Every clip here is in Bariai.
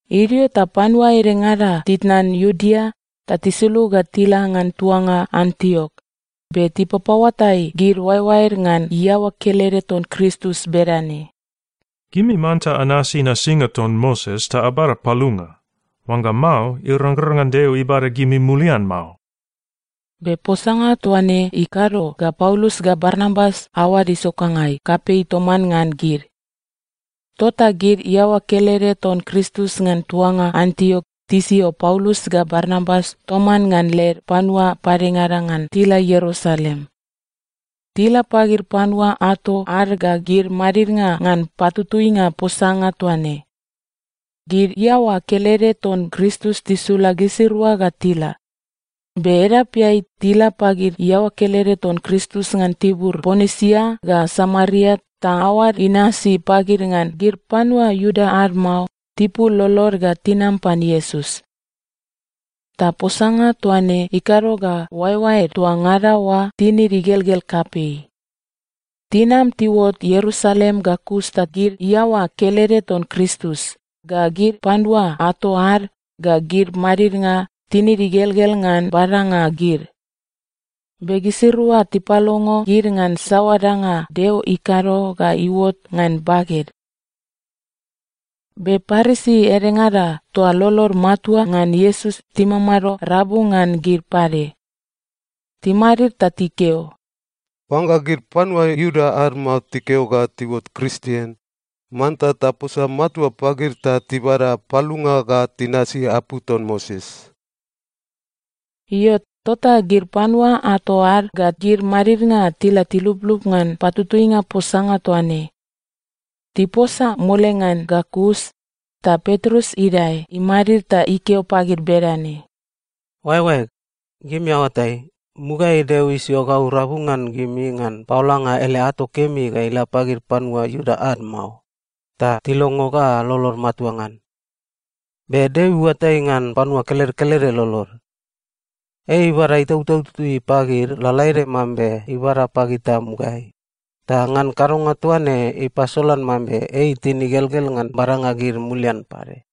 Idio ta panua edengada titnan Iudea ta tisulug ga tila ngan tuanga Antiok, be tipapaoatai gid oaeoaed ngan iaoa kelede ton Kristus bedane, “Gimi manta anasi nasinga ton Moses ta abada palunga. Oangga mao, irangrang ngan Deo ibada gimi mulian mao.” Be posanga toa ne ikado ga Paulus ga Barnabas aoad isokangai kapei toman ngan gid. Tota gid iaoa kelede ton Kristus ngan tuanga Antiok tisio Paulus ga Barnabas toman ngan led panua padengada ngan tila Ierusalem. Tila pagid panua ato ad ga gid madidnga ngan patutuinga posanga toa ne. Gid iaoa kelede ton Kristus tisula gisirua ga tila, be edapeai, tila pagid iaoa kelede ton Kristus ngan tibur Ponisia ga Samaria ta aoad inasi pagid ngan gid panua Iuda ad mao tipul lolod ga tinam pan Iesus. Ta posanga toa ne ikado ga oaeoaed toa ngada oa tinid igelgel kapei. Tinam tiuot Ierusalem ga kus ta gid iaoa kelede ton Kristus, ga gid panua ato ad, ga gid madidnga tinid igelgel ngan badanga gid. Be gisirua tipalongo gid ngan saoa danga Deo ikado ga iuot ngan baged. Be Parisi edengada toa lolod matua ngan Iesus timamado rabu ngan gid pade. Timadid ta tikeo, “Oangga gid panua Iuda ad mao tikeo ga tiuot Kristien, manta taposa matua pagid ta tibada palunga ga tinasi apu ton Moses.” Io, tota gid panua ato ad ga gid madidnga tila tiluplup ngan patutuinga posanga toa ne. Tiposa mole ngan ga kus, ta Petrus idae imadid ta ikeo pagid bedane, “Oaeoaeg, gimi aoatai, mugaeai Deo isio gau rabu ngan gimi ngan paolanga ele ato kemi ga ila pagid panua Iuda ad mao, ta tilongo ga lolod matua ngan. Be Deo iuatai ngan panua kelede kelede lolod. Ei ibada Itautau Tutui pagid lalaede mambe ibada pagita mugaeai, ta ngan kadonga toa ne ipasolan mambe ei itin igelgel ngan badanga gid mulian pade.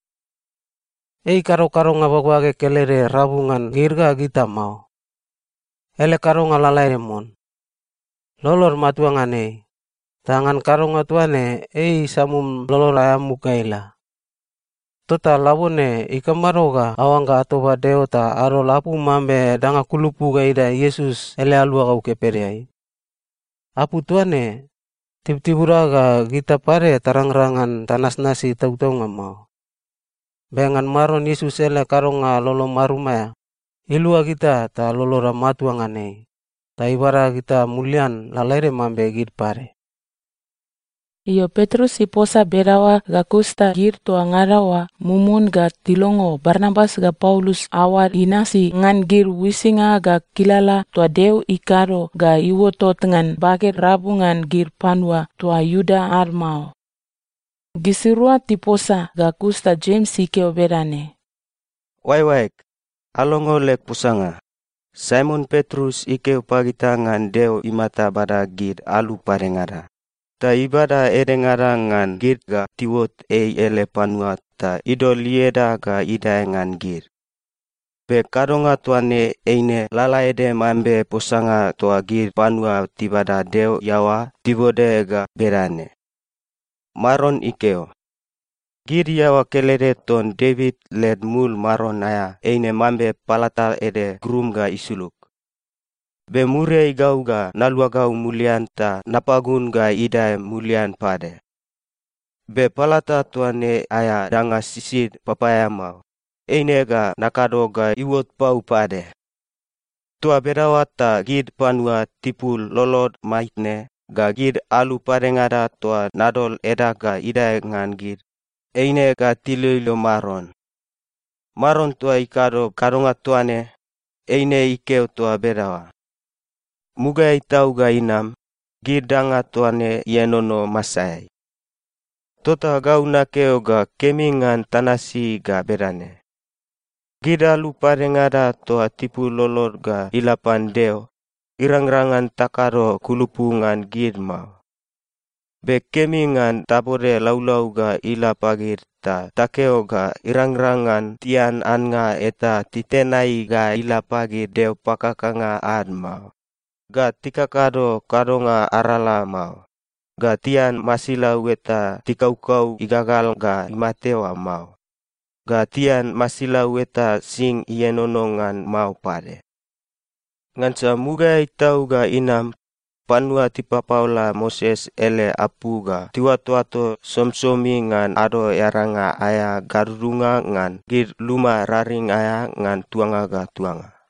Ei ikado kadonga bagbage kelede rabu ngan gid ga gita mao. Ele kadonga lalaede mon. Lolod matua ngan ei, ta ngan kadonga toa ne ei isamum lolod aea muk ga ila. Tota labone ikamado ga aoangga atoba Deo ta adol apu mambe danga kulupu ga idae Iesus ele aluagau kepedeai? Apu toa ne, tibutibuda ga gita pade tarangrang ngan tanasnasi tautaunga mao. Be ngan Maron Iesus ele kadonga lolo marum aea, ilua gita ta loloda matua ngan ei, ta ibada gita mulian lalaede mambe gid pade.” Io, Petrus iposa bedaoa ga kus ta gid toa ngada oa mumun ga tilongo Barnabas ga Paulus aoad inasi ngan gid uisinga ga kilala toa Deo ikado ga iuotot ngan baged rabu ngan gid panua toa Iuda ad mao. Gisirua tiposa ga kus ta Jems ikeo bedane, “Oaeoaeg, alongo leg posanga. Saimon Petrus ikeo pagita ngan Deo imata bada gid alu padengada, ta ibada edengada ngan gid ga tiuot ei ele panua ta idol ieda ga idae ngan gid. Be kadonga toa ne eine lalaede mambe posanga toa gid panua tibada Deo iaoa tibode ga bedane, “‘Maron ikeo, “Gid iaoa kelede ton Devit led mul maron aea eine mambe palata ede grum ga isulug. Be muriai gau ga naluagau mulian ta napagun ga idae mulian pade. Be palata toa ne aea danga sisid papaeamao, eine ga nakado ga iuot pau pade. Toa bedaoa ta gid panua tipul lolod maitne ga gid alu padengada toa nadol edag ga idae ngan gid, eine ga tiloilo Maron. Maron toa ikado kadonga toa ne, eine ikeo toa bedaoa.” Mugaeai tau ga inam, gid danga toa ne ienono masaeai.’ “Tota gau nakeo ga kemi ngan tanasi ga bedane: Gid alu padengada toa tipul lolod ga ila pan Deo, irangrang ngan takado kulupu ngan gid mao. Be kemi ngan tabode laulau ga ila pagid ta takeo ga irangrang ngan tian annga eta titenai ga ila pagid deo pakakanga ad mao, ga tikakado kadonga arala mao, ga tian masilau eta tikaukau igagal ga imate oa mao, ga tian masilau eta sing ienono ngan mao pade. Ngansa mugaeai tau ga inam, panua tipapaola Moses ele apu ga tiuatoato somisomi ngan Ado Earainga aea gadudunga ngan gid luma raring aea ngan tuanga ga tuanga.”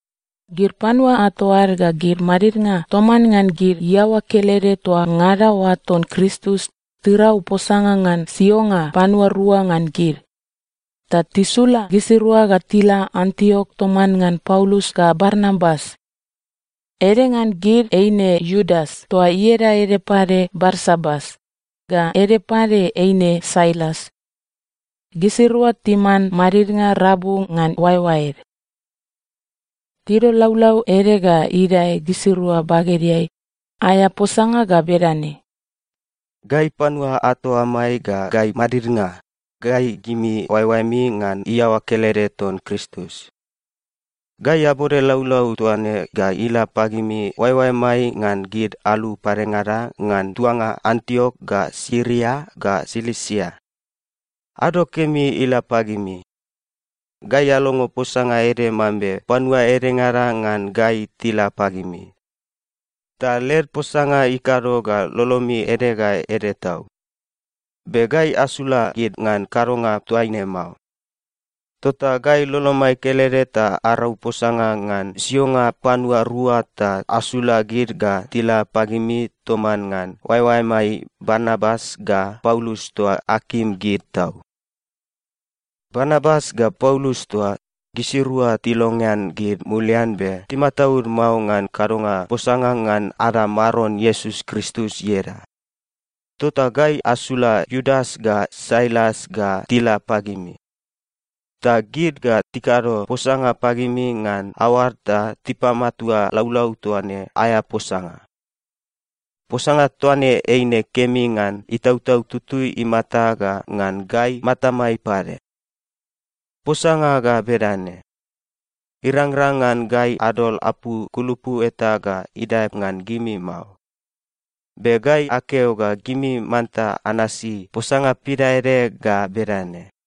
Gid panua ato ad ga gid madidnga toman ngan gid iaoa kelede toa ngada oa ton Kristus tirau posanga ngan sionga panua rua ngan gid, ta tisula gisirua ga tila Antiok toman ngan Paulus ga Barnabas. Ede ngan gid eine Iudas toa ieda ede pade Barsabas, ga ede pade eine Sailas. Gisirua timan madidnga rabu ngan oaeoaed. Tidol laulau ede ga idae gisirua bagedeai, aea posanga ga bedane: Gai panua ato amai ga gai madidnga, gai gimi oaeoaemi ngan iaoa kelede ton Kristus. Gai abode laulau toa ne ga ila pagimi oaeoaemai ngan gid alu padengada ngan tuanga Antiok ga Siria ga Silisia. Ado kemi ila pagimi. Gai alongo posanga ede mambe panua edengada ngan gai tila pagimi, ta led posanga ikado ga lolomi ede ga ede tau. Be gai asula gid ngan kadonga toaine mao. Tota gai lolomai kelede ta arau posanga ngan sionga panua rua ta asula gid ga tila pagimi toman ngan oaeoaemai Barnabas ga Paulus toa akim gid tau. Barnabas ga Paulus toa, gisirua tilongean gid mulian be timataud mao ngan kadonga posanga ngan ada Maron Iesus Kristus ieda. Tota gai asula Iudas ga Sailas ga tila pagimi, ta gid ga tikado posanga pagimi ngan aoad ta tipamatua laulau toa ne aea posanga. Posanga toa ne eine kemi ngan Itautau Tutui imata ga ngan gai matamai pade. Posanga ga bedane: Irangrang ngan gai adol apu kulupu eta ga idae ngan gimi mao. Be gai akeo ga gimi manta anasi posanga pidaede ga bedane: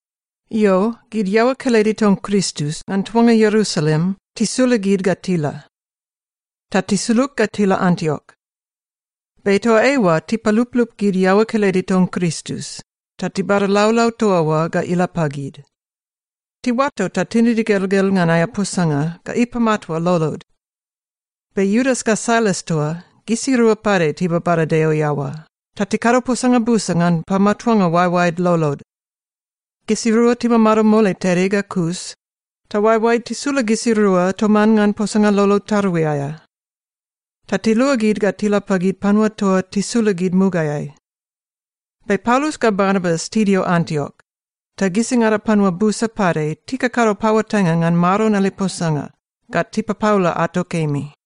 Io, gid iaoa kelede ton Kristus ngan tuanga Ierusalem tisula gid ga tila. Ta tisulug ga tila Antiok. Be toa eoa tipaluplup gid iaoa kelede ton Kristus ta tibada laulau toa oa ga ila pagid. Tiuato ta tinid igelgel ngan aea posanga ga ipamatua lolod. Be Iudas ga Sailas toa, gisirua pade tibabada Deo iaoa ta tikado posanga busa ngan pamatuanga oaeoaed lolod. Gisirua timamado mole tede ga kus, ta oaeoaed tisula gisirua toman ngan posanga lolo tarui aea. Ta tiluagid ga tila pagid panua toa tisula gid mugaeai. Be Paulus ga Barnabas tidio Antiok, ta gisingada panua busa pade tikakado paoatainga ngan Maron ele posanga ga tipapaola ato kemi.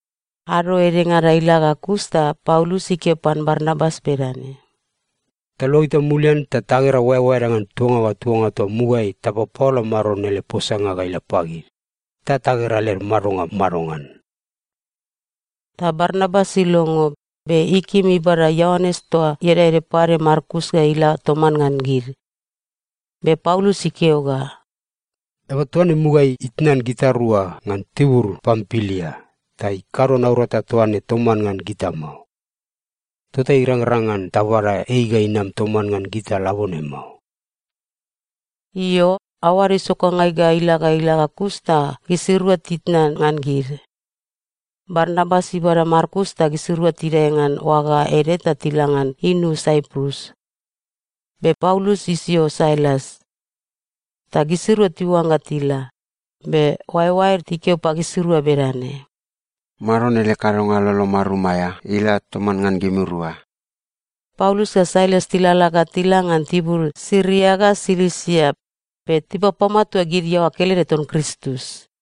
Ado edengada ila ga kus ta Paulus ikeo pan Barnabas bedane, “Taluagita mulian ta tagera oaeoaeda ngan tuanga ga tuanga toa mugaeai tapapaola Maron ele posanga ga ila pagid, ta tagera led madonga madongan.” Ta Barnabas ilongo, be ikim ibada Ioanes toa ieda ede pade Markus ga ila toman ngan gid. Be Paulus ikeo ga, “Eaba toa ne mugaeai itnan gitarua ngan tibur Pampilia ta ikado naurata toa ne toman ngan gita mao. Tota irangrang ngan tabada ei ga inam toman ngan gita labone mao.” Io, aoad isokangai ga ila ga ila ga kus ta gisirua titnan ngan gid. Barnabas ibada Markus ta gisirua tidae ngan oaga ede ta tila ngan inu Saiprus. Be Paulus isio Sailas. Ta gisirua tiuangga tila, be oaeoaed tikeo pagisirua bedane, “Maron ele kadonga lolo marum aea ila toman ngan gimirua.” Paulus ga Sailas tilalala ga tila ngan tibur Siria ga Silisia be tipapamatua gid iaoa kelede ton Kristus.